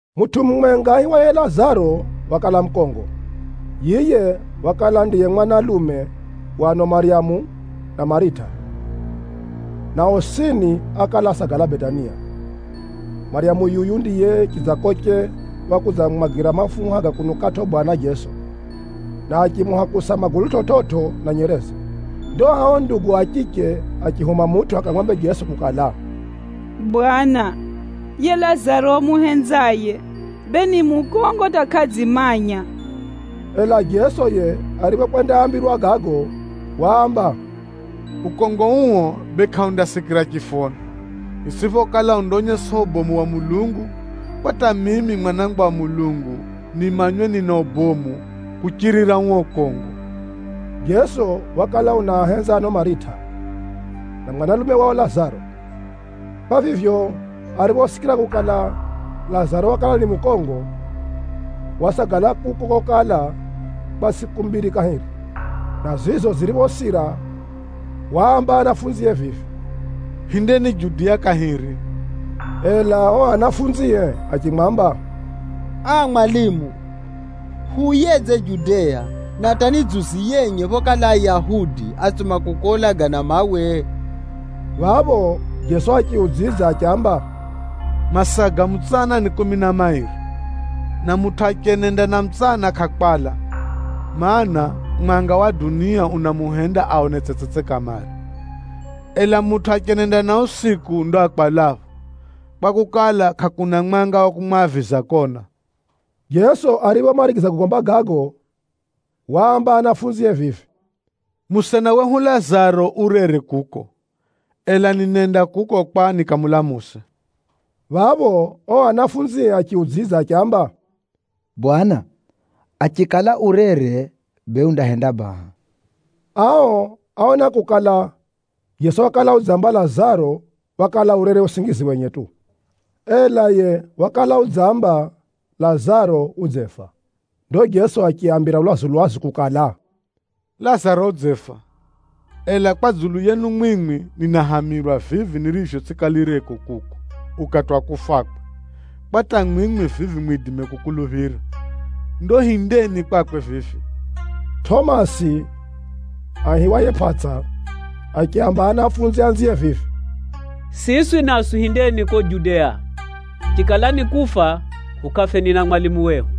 Mutʼu mumwenga aihiwaye Lazaro wakala mukongo. Yiye wakala ndiye mwanalume wa ano Maryamu na Marita, na osini ákala asagala Betania. (Maryamu yuyu ndiye chidzakoche wakudzamumwagira mafuha ga kunukʼatʼo Bwana Jeso, na achimuhakusa magulu chividzo na nyereze.) Ndo ao ndugu a chiche achihuma mutʼu akamwambe Jeso kukala, “Bwana, yiye Lazaro umuhenzaye, bee ni mukongo hata kʼadzimanya!” Ela Jeso yiye ariphokwendaambirwa gago, waamba, “Ukongo uo bee kʼaundasikira chifoni, itsʼiphokala undaonyesa ubomu wa Mulungu, kwa hata mimi Mwanangwa wa Mulungu nimanywe nina ubomu kuchirira uo ukongo.” Jeso wakala unaahenza ano Marita, na mwanalume wao Lazaro. Kwa vivyo, ariphosikira kukala, Lazaro wakala ni mukongo, wasagala kuko kokala kwa tsʼiku mbiri kahiri, na zizo ziriphosira, waamba anafunzie vivi, “Hindeni Judea kahiri.” Ela o anafunzie achimwamba, “Aa! Mwalimu, huuyedze Judea, na hata ni dzuzi yenye phokala Ayahudi átsuma kukuulaga na mawe?” Phapho Jeso achiudzidza achiamba, “Masaa ga mutsana ni kumi na mairi, na mutʼu achenenda na mutsana kʼakwala, mana, mwanga wa dunia unamuhenda aone tsetsetse kamare. Ela mutʼu achenenda na usiku ndo akwalapho kwakukala, kʼakuna mwanga wa kumwaviza kona.” Jeso ariphomarigiza kugomba gago, waamba anafunzie vivi, “Musena wehu Lazaro urere kuko, ela ninenda kuko kwa nikamulamuse.” Phapho o anafunzie achiudzidza achiamba, “Bwana, achikala urere, bee undahenda baha.” Ao áona kukala, Jeso wakala udzamba Lazaro wakala urere usingizi wenye tu, ela yiye wakala udzamba Lazaro udzefa. Ndo Jeso achiaambira lwazu-lwazu kukala, “Lazaro udzefa. Ela kwa dzulu yenu mwimwi, ninahamirwa vivi nirivyo tsʼikalireko kuko ukati wa kufakwe, kwa hata mwimwi vivi mwidime kukuluphira. Ndo hindeni kwakwe vivi.” Tʼomasi (aihiwaye Pʼatsa) achiaamba anafunzi anzie vivi, “Siswi naswi hindeni ko Judea. Chikala ni kufa, hukafeni na mwalimu wehu.”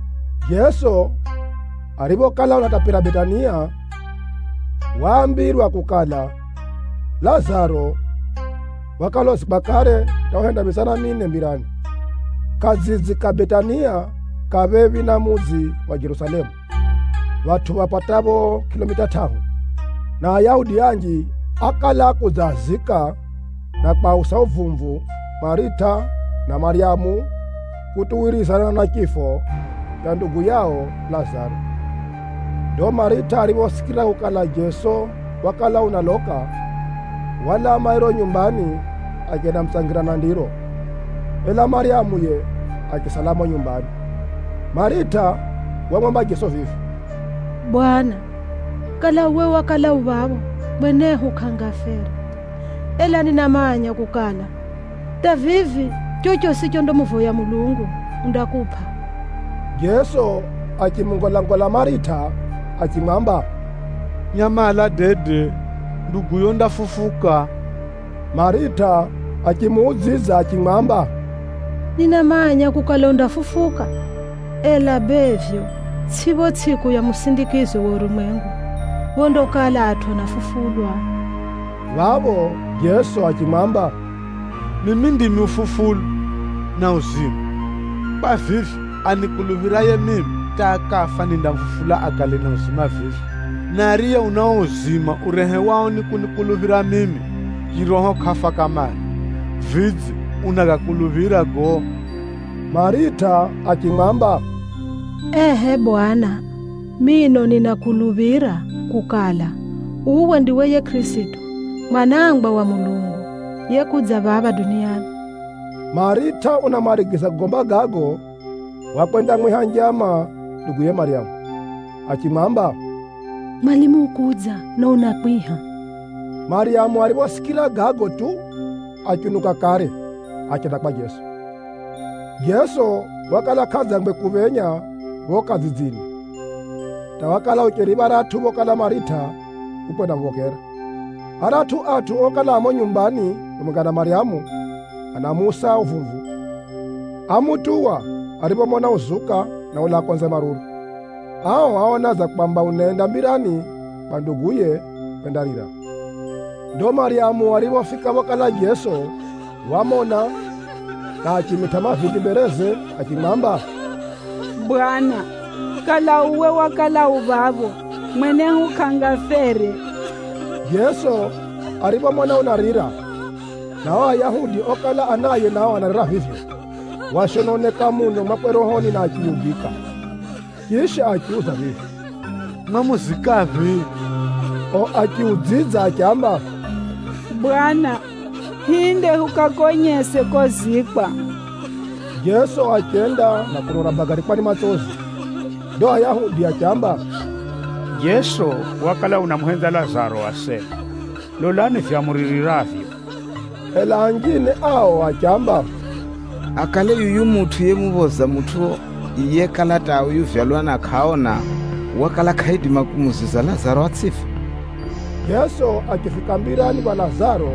Jeso ariphokala unatapira Betania, waambirwa kukala, Lazaro wakala uzikwa kare hata uhenda mitsana mine mbirani. Kadzidzi ka Betania ka phephi na mudzi wa Jerusalemu, phatʼu phapatapho kʼilomita tʼahu. Na Ayahudi anji ákala akudzaazika, na kwausa uvumvu Marita na Maryamu kutuwirizana na chifo cha ndugu yao Lazaro. Ndo Marita ariphosikira kukala Jeso wakala unaloka, walaa mairo nyumbani achendamutsangira na ndiro, ela Maryamu yiye, achisala mumo nyumbani. Marita wamwamba Jeso vivi, “Bwana, kala uwe wakala u phapho, mwenehu kʼangafere! Ela ninamanya kukala, hata vivi chochosi chondamuvoya Mulungu, undakupʼa.” Jeso achimungolangola Marita achimwamba, “Nyamala dede, nduguyo undafufuka.” Marita achimuudzidza achimwamba, “Ninamanya kukala undafufuka, ela bee vivyo, tsʼi pho tsʼiku ya musindikizo wa urumwengu, phondakala atʼu anafufulwa?” Phapho Jeso achimwamba, “Mimi ndimi ufufulo, na uzima. Kwa vivyo, anikuluphiraye mimi, hata akafa nindamufufula akale na uzima vivyo, na ariye una uo uzima urehewao ni kunikuluphira mimi, chiroho kʼafa kamare. Vidze, unagakuluphira gago?” Marita achimwamba, “Ehʼe, Bwana! Mino ninakuluphira kukala, uwe ndiwe yiye Kʼirisito, Mwanangwa wa Mulungu, yekudza phapha duniani.” Marita unamarigiza kugomba gago, wakwendamwiha njama nduguye Maryamu, achimwamba, “Mwalimu ukudza, na unakwiha.” Maryamu ariphosikira gago tu achiunuka kare, achenda kwa Jeso. Jeso wakala kʼadzangwe kuphenya pho kadzidzini, hata wakala ucheri pharatʼu phokala Marita ukwendamuphokera. Aratʼu atʼu okala a mumo nyumbani phamwenga na Maryamu anamuusa uvumvu, ámutuwa ariphomona uzuka na ulaa konze maruru. Ao áona dza kwamba unenda mbirani kwa nduguye kwendarira. Ndo Maryamu ariphofika phokala Jeso, wamona, na achimitʼa mavindi mbereze achimwamba, “Bwana, kala uwe wakala u phapho, mwenehu kʼangafere!” Jeso ariphomona unarira, na ao Ayahudi okala anaye nao anarira vivyo, washononeka muno mwakwe rohoni na achiyugika. Chisha achiuza vivi, “Mwamuzikaphi?” O achiudzidza achiamba, “Bwana, hinde hukakonyese kozikwa.” Jeso achenda na kuno unabagarikwa ni matsozi. Ndo Ayahudi achiamba, “Jeso wakala unamuhenza Lazaro asena! Lolani vivyo amuririravyo!” Ela anjine ao achiamba, “Akale yuyu mutʼu yemuphoza mutʼu yekala hata uvyalwa na kʼaona, wakala kʼaidima kumuziza Lazaro atsʼife?” Jeso achifika mbirani pha Lazaro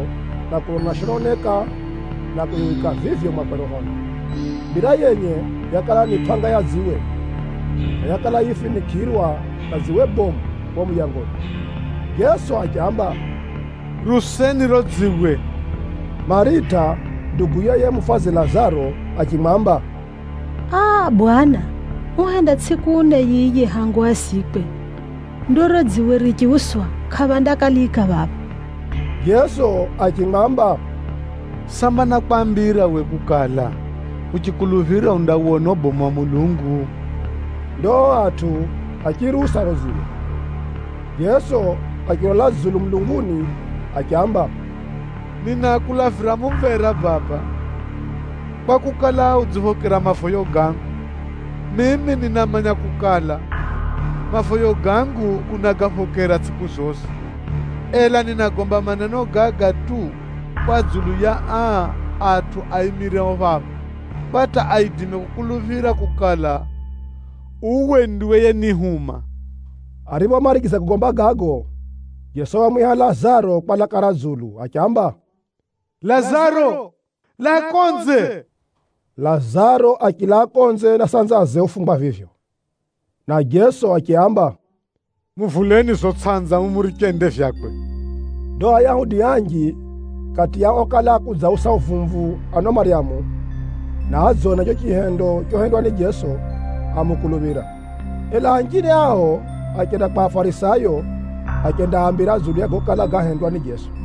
na kuno unashononeka na kuyugika vivyo mwakwe rohoni. Mbira yenye yakala ni pʼanga ya dziwe, na yakala yifinikʼirwa na dziwe bomu pho muyangoni. Jeso achiamba, “Riuseni riro dziwe!” Marita nduguye yiye mufadzi Lazaro achimwamba, “Aa! Bwana, uhenda tsʼiku ne yiye hangu azikwe. Ndo riro dziwe richiuswa, kʼaphandakalika phapha.” Jeso achimwamba, “Samba nákwambira we kukala, uchikuluphira undawona ubomu wa Mulungu?” Ndo o atʼu achiriusa riro dziwe. Jeso achilola dzulu mulunguni achiamba, “Ninakulavira mumvera Baba, kwakukala, udziphokera mavoyo gangu. Mimi ninamanya kukala, mavoyo gangu unagaphokera tsʼiku zosi. Ela ninagomba maneno gaga tu kwa dzulu ya aa atʼu aimireo phapha, kwa hata aidime kukuluphira kukala, uwe ndiwe yenihuma.” Ariphomarigiza kugomba gago, Jeso wamwiha Lazaro kwa laka ra dzulu achiamba, “Lazaro! Laa konze!” Lazaro achilaa konze na sanzaze ufungwa vivyo, na Jeso achiaamba, “Muvuleni zo sanza mumuriche ende vyakwe.” Ndo Ayahudi anji kati ya okala akudzaausa uvumvu ano Maryamu, na adzona cho chihendo chohendwa ni Jeso, ámukuluphira. Ela anjine ao achenda kwa Afarisayo achendaambira dzulu ya gokala gahendwa ni Jeso.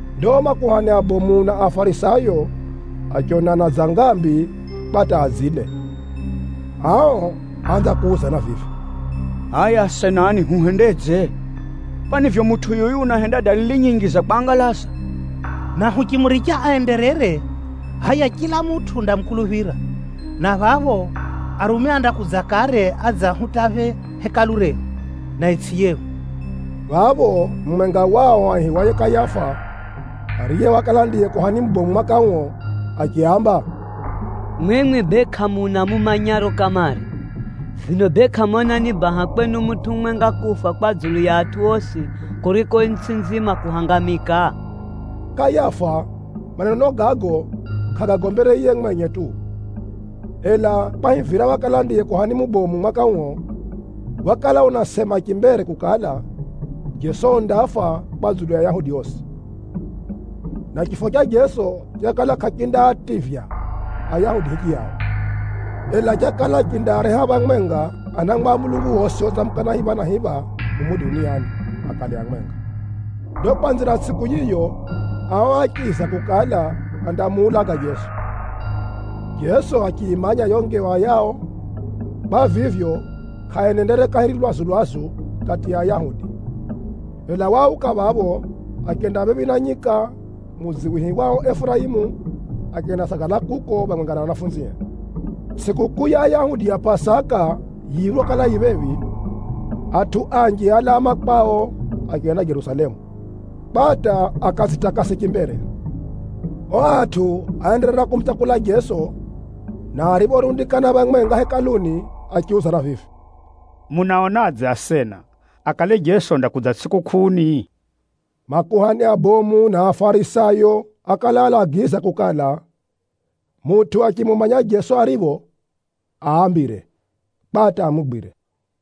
Ndo makuhani abomu na Afarisayo achionana dza ngambi kwa hata adzile. Ao áanza kuuzana vivi, “Hʼaya asenani! Huhendedze? Kwani vivyo mutʼu yuyu unahenda dalili nyinji za kwangalaza. Na huchimuricha aenderere, hʼaya chila mutʼu undamukuluphira, na phapho Arumi andakudza kare adze ahutaphe Hekalu rehu, na itsʼi yehu!” Phapho mumwenga wao aihiwaye Kayafa, ariye wakala ndiye kuhani mubomu mwaka uo, achiaamba, “Mwimwi bee kʼamuna mumanyaro kamare! Vino bee, kʼamona ni baha kwenu mutʼu mumwenga kufa kwa dzulu ya atʼu osi, kuriko itsʼi nzima kuhangamika?” Kayafa maneno gago kʼagagombere yiye mwenye tu, ela kwahivira wakala ndiye kuhani mubomu mwaka uo, wakala unasema chimbere kukala, Jeso undafa kwa dzulu ya Ayahudi osi. Na chifo cha Jeso chakala kʼachindaativya Ayahudi hichiyao, ela chakala chindaareha phamwenga anangwa a Mulungu osi otsamukana hipha na hipha mumu duniani akale amwenga. Ndo kwanzira tsʼiku yiyo, ao áchiza kukala, andamuulaga Jeso. Jeso achiyimanya yo ngewa yao. Kwa vivyo, kʼaenendere kahiri lwazu-lwazu kati ya Ayahudi, ela wauka phapho, achenda phephi na nyika, mudzi wihiwao Efuraimu, achendasagala kuko phamwenga na anafunzie. Tsʼikukʼuu ya Ayahudi ya Pʼasaka yiriphokala yi phephi, atʼu anji álaa makwao achenda Jerusalemu, kwa hata akadzitakase chimbere. O atʼu áenderera kumutsakula Jeso, na ariphorundikana phamwenga Hekaluni achiuzana vivi, “Munaonadze asena! Akale Jeso undakudza tsʼikukʼuuni?” Makuhani abomu na Afarisayo ákala alagiza kukala, mutʼu achimumanya Jeso aripho, aambire, kwa hata amugwire.